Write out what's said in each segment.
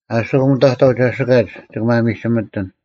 ᐊᓯᑯᒻ ᑕᑥᐤ ᒐᓯᑲᒡ ᒋᑭ ᒪᒥᒋᒥᑎᓐ,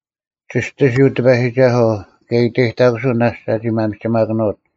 ᒋᔅᑎᓯᐤ ᑎᐸᔨᒋᒐᓱᐤ, ᑭᔭ ᐃᑕᔨᑕᑯᓱᐤ ᓇᔅᒡ ᒐᒋ ᒪᒥᒋᒪᑭᓄᐅᑦ;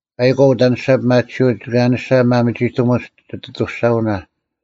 ᐸᐃᒂᐤ ᐅᑦ ᐊᔭᓂᔅᒐ ᐱᒪᑎᓯᐅᒡ ᒋᑭ ᐊᔭᓂᔅᒐ ᒪᒥᒋᑎᒧᒡ ᒋᑦ ᐊᑐᔅᒐᐅᓇ,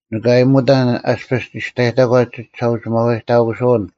ᓂᑭ ᐊᔨᒧᑕᓐ ᐊᔅᐱᔅ ᒋᔅᑕᔨᑕᒂᒡ ᒋᒋᓴᐅᒋᒪᐛᔨᑕᑯᓱᐅᓐ,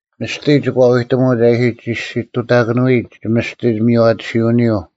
ᒥᔅᑎ ᒋᑭ ᐛᐎᑎᒧᒡ ᐊ ᐃᓯ ᒋᔅᒋᑐᑕᑭᓄᐎᔨᒡ ᒋᒥᔅᑎ ᒥᔽᑎᓯᐅᓂᔪᐤ,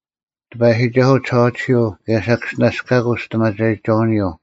ᑎᐸᔨᒋᒐᓱᐤ ᒋᓴᐛᑎᓯᐤ, ᑭᔭ ᓴᑭᔅᒋᓇᔅᑲᑯᐤ ᒋᔅᑎᒪᒐᔨᒋᒐᐅᓂᔪᐤ;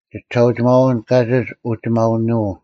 ᒋᒋᓴᒋᒪᐅᓐ ᑲᒋᒡ ᐅᒋᒪᐅᓄᐤ,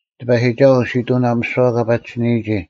ᑎᐸᔨᒋᒐᓱᐤ ᓯᑐᓇᐤ ᒥᓯᐛ ᑲ ᐸᒋᓯᓂᔨᒋ,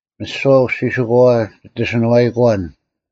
ᒥᓯᐛ ᐅᔅᒋᓯᑯᐛᐛ ᒋᑦ ᐊᓯᓄᐛᐃᑯᐛᓐ;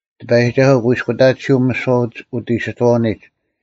ᑎᐸᔨᒋᒐᓱᐤ ᑯᐃᔅᑯᑕᑎᓯᐤ ᒥᓯᐛ ᐅᑦ ᐃᓯᑥᐅᓂᒡ,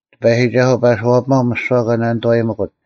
ᑎᐸᔨᒋᒐᓱᐤ ᐸᓱᐛᐱᒪᐤ ᒥᓯᐛ ᑲ ᓂᑐᐛᔨᒥᑯᑦ,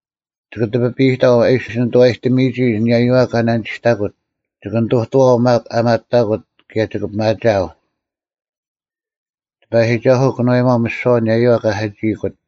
ᒋᑭ ᑎᐱᐸᔨᑕᐤ ᐊ ᐃᓯ ᓂᑐᐛᔨᑎᒥᔨᒋ ᐊᓂᔭᔪᐛ ᑲ ᓇᓂᒋᔅᑕᑯᑦ: ᒋᑭ ᓂᑐᑐᐛᐤ ᒪᒃ ᐊ ᒪᑕᑯᑦ, ᑭᔭ ᒋᑭ ᐱᒪᒋᐊᐤ: ᑎᐸᔨᒋᒐᓱᐤ ᑭᓄᐛᔨᒪᐤ ᒥᓯᐛ ᐊᓂᔭᔪᐛ ᑲ ᓴᒋᐃᑯᑦ;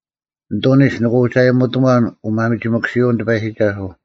ᓂᑐᓂᒡ ᓂᑭ ᐅᒋ ᐊᔨᒧᑎᒺᓐ ᐅᒪᒥᒋᒥᑯᓯᐅᓐ ᑎᐸᔨᒋᒐᓱᐤ: